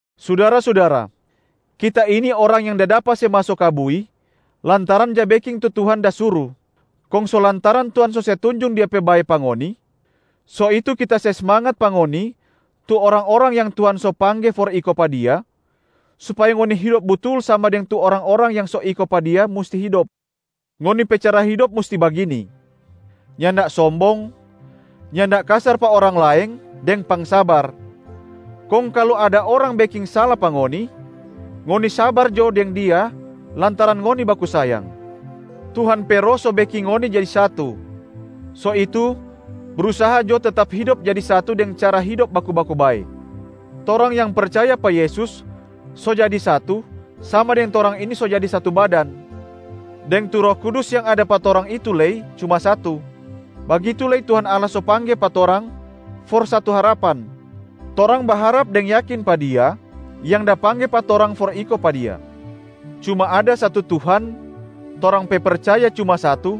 Sudara-sudara, kita ini orang yang da dapa se maso ka bui lantaran ja beking tu Tuhan da suru. Kong so lantaran Tuhan so se tunjung Dia pe bae pa ngoni, so itu kita se smangat pa ngoni tu orang-orang yang Tuhan so pangge for iko pa Dia, supaya ngoni hidop butul sama deng tu orang-orang yang so iko pa Dia musti hidop. Ngoni pe cara hidop musti bagini: nyanda sombong, nyanda kasar pa orang laeng deng pangsabar. Kong kalu ada orang beking sala pa ngoni, ngoni sabar jo deng dia lantaran ngoni baku sayang. Tuhan pe Roh so beking ngoni jadi satu, so itu brusaha jo tetap hidop jadi satu deng cara hidop baku-baku bae. Torang yang percaya pa Yesus so jadi satu sama deng torang ini so jadi satu badan, deng tu Roh Kudus yang ada pa torang itu lei cuma satu. Bagitu lei Tuhan Allah so pangge pa torang for satu harapan, torang baharap deng yakin pa Dia yang da pangge pa torang for iko pa Dia. Cuma ada satu Tuhan, torang pe percaya cuma satu,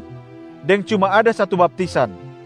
deng cuma ada satu baptisan.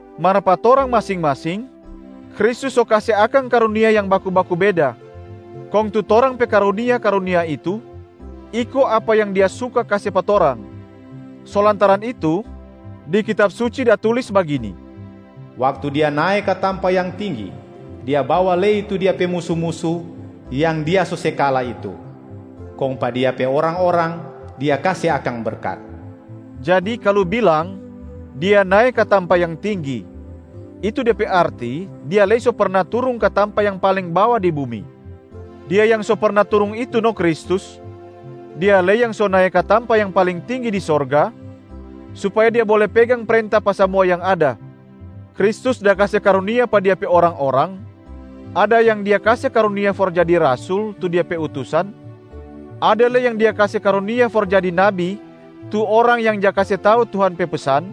Mar pa torang masing-masing, Kristus so kase akang karunia yang baku-baku beda, kong tu torang pe karunia-karunia itu iko apa yang Dia suka kase pa torang. So lantaran itu, di Kitab Suci da tulis bagini, “Waktu Dia nae ka tampa yang tinggi, Dia bawa lei tu Dia pe musu-musu yang Dia so se kala itu, kong pa Dia pe orang-orang Dia kase akang berkat.” Jadi kalu bilang, “Dia nae ka tampa yang tinggi,” itu de pe arti Dia lei so perna turung ka tampa yang paling bawa di bumi. Dia yang so perna turung itu no Kristus, Dia lei yang so nae ka tampa yang paling tinggi di sorga, supaya Dia bole pegang prenta pa samua yang ada. Kristus da kase karunia pa Dia pe orang-orang, ada yang Dia kase karunia for jadi rasul tu Dia pe utusan, ada lei yang Dia kase karunia for jadi nabi tu orang yang ja kase tau Tuhan pe pesan,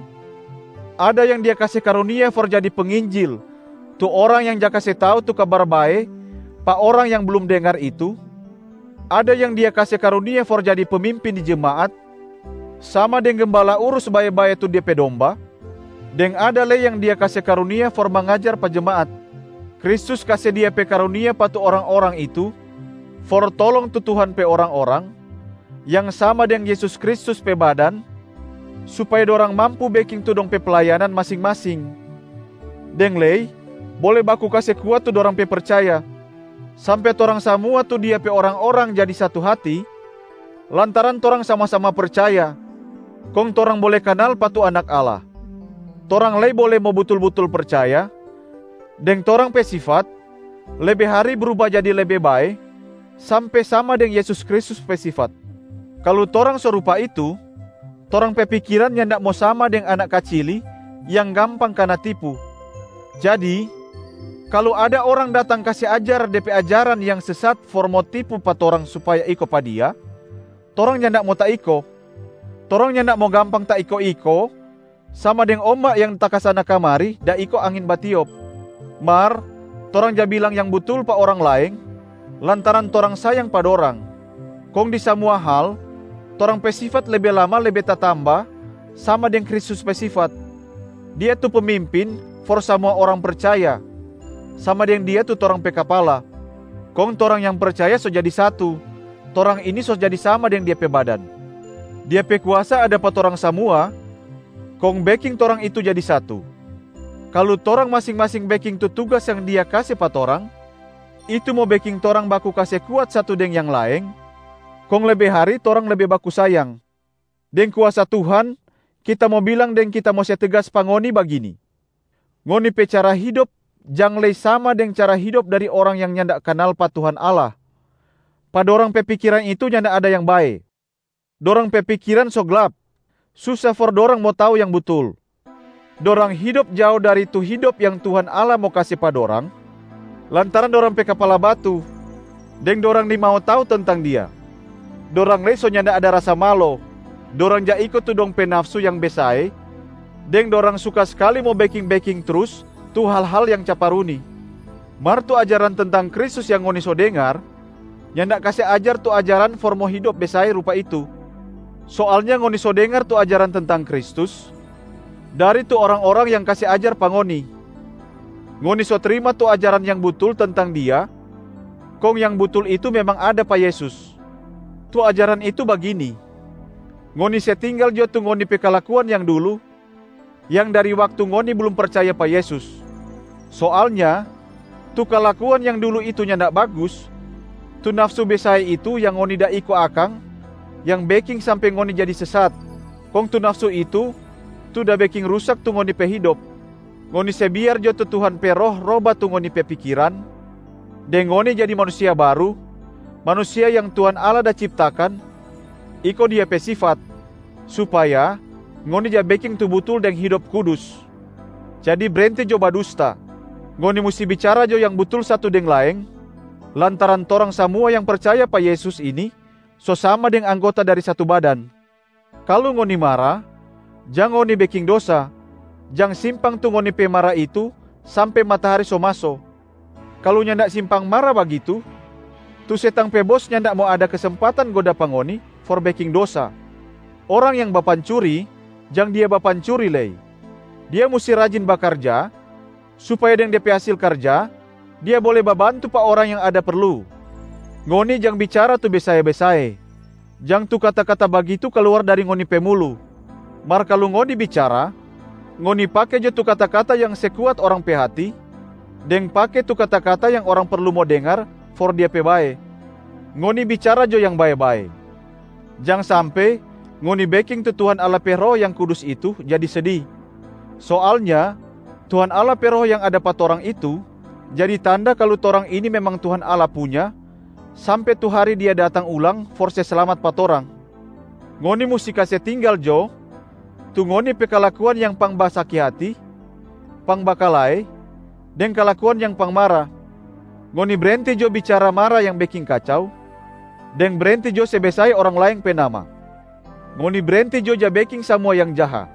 ada yang Dia kase karunia for jadi penginjil tu orang yang ja kase tau tu Kabar Bae pa orang yang blum dengar itu, ada yang Dia kase karunia for jadi pemimpin di jemaat sama deng gembala urus bae-bae tu de pe domba, deng ada lei yang Dia kase karunia for mangajar pa jemaat. Kristus kase Dia pe karunia pa tu orang-orang itu for tolong tu Tuhan pe orang-orang yang sama deng Yesus Kristus pe badan supaya dorang mampu beking tu dong pe playanan masing-masing, deng lei bole baku kase kuat tu dorang pe percaya, sampe torang samua tu Dia pe orang-orang jadi satu hati lantaran torang sama-sama percaya, kong torang bole kanal pa tu Anak Allah, torang lei bole mo butul-butul percaya, deng torang pe sifat lebe hari bruba jadi lebe bae sampe sama deng Yesus Kristus pe sifat. Kalu torang so rupa itu, torang pe pikiran nyanda mo sama deng anak kacili yang gampang kana tipu. Jadi kalu ada orang datang kase ajar de pe ajaran yang sesat for mo tipu pa torang supaya iko pa dia, torang nyanda mo taiko. Torang nyanda mo gampang taiko-iko sama deng omba yang takasana-kamari da iko angin batiop. Mar torang ja bilang yang butul pa orang laeng lantaran torang sayang pa dorang, kong di samua hal torang pe sifat lebe lama lebe tatamba sama deng Kristus pe sifat. Dia tu pemimpin for samua orang percaya, sama deng Dia tu torang pe kapala. Kong torang yang percaya so jadi satu, torang ini so jadi sama deng Dia pe badan. Dia pe kuasa ada pa torang samua kong beking torang itu jadi satu. Kalu torang masing-masing beking tu tugas yang Dia kase pa torang, itu mo beking torang baku kase kuat satu deng yang laeng kong lebe hari torang lebe baku sayang. Deng kuasa Tuhan, kita mo bilang deng kita mo se tegas pa ngoni bagini: ngoni pe cara hidop jang lei sama deng cara hidop dari orang yang nyanda kanal pa Tuhan Allah, pa dorang pe pikiran itu nyanda ada yang bae. Dorang pe pikiran so glap, susa for dorang mo tau yang butul. Dorang hidop jao dari tu hidop yang Tuhan Allah mo kase pa dorang lantaran dorang pe kapala batu, deng dorang nimau tau tentang Dia. Dorang lei so nyanda ada rasa malo, dorang ja iko tu dong pe nafsu yang besae deng dorang suka skali mo beking-beking trus tu hal-hal yang caparuni. Mar tu ajaran tentang Kristus yang ngoni so dengar, nyanda kase ajar tu ajaran for mo hidop besae rupa itu. Soalnya ngoni so dengar tu ajaran tentang Kristus dari tu orang-orang yang kase ajar pa ngoni. Ngoni so trima tu ajaran yang butul tentang Dia kong yang butul itu memang ada pa Yesus. Tu ajaran itu bagini: ngoni se tinggal jo tu ngoni pe kalakuan yang dulu, yang dari waktu ngoni blum percaya pa Yesus. Soalnya tu kalakuan yang dulu itu nyanda bagus, tu nafsu besae itu yang ngoni da iko akang yang beking sampe ngoni jadi sesat, kong tu nafsu itu tu da beking rusak tu ngoni pe hidop. Ngoni se biar jo tu Tuhan pe Roh roba tu ngoni pe pikiran, deng ngoni jadi manusia baru, manusia yang Tuhan Allah da ciptakan iko Dia pe sifat, supaya ngoni ja beking tu butul deng hidop kudus. Jadi brenti jo badusta, ngoni musti bicara jo yang butul satu deng laeng lantaran torang samua yang percaya pa Yesus ini so sama deng anggota dari satu badan. Kalu ngoni mara, jang ngoni beking dosa, jang simpang tu ngoni pe mara itu sampe matahari so maso. Kalu nyanda simpang mara bagitu, tu setang pe bos nyanda mo ada kesempatan goda pa ngoni for beking dosa. Orang yang bapancuri, jang dia bapancuri lei. Dia musti rajin bakarja supaya deng de pe hasil karja dia bole babantu pa orang yang ada perlu. Ngoni jang bicara tu besae-besae, jang tu kata-kata bagitu kaluar dari ngoni pe mulu. Mar kalu ngoni bicara, ngoni pake jo tu kata-kata yang se kuat orang pe hati, deng pake tu kata-kata yang orang perlu mo dengar for dia pe bae. Ngoni bicara jo yang bae-bae, jang sampe ngoni beking tu Tuhan Allah pe Roh yang Kudus itu jadi sedi. Soalnya Tuhan Allah pe Roh yang ada pa torang itu jadi tanda kalu torang ini memang Tuhan Allah punya sampe tu hari Dia datang ulang for se slamat pa torang. Ngoni musti kase tinggal jo tu ngoni pe kalakuan yang pangbasaki hati, pangbakalae deng kalakuan yang pangmara. Ngoni brenti jo bicara mara yang beking kacau, deng brenti jo se besae orang laeng pe nama. Ngoni brenti jo ja beking samua yang jaha.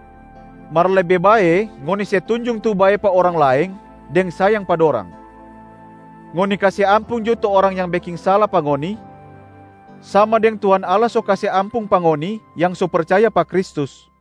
Mar lebe bae ngoni se tunjung tu bae pa orang laeng deng sayang pa dorang. Ngoni kase ampung jo tu orang yang beking sala pa ngoni, sama deng Tuhan Allah so kase ampung pa ngoni yang so percaya pa Kristus.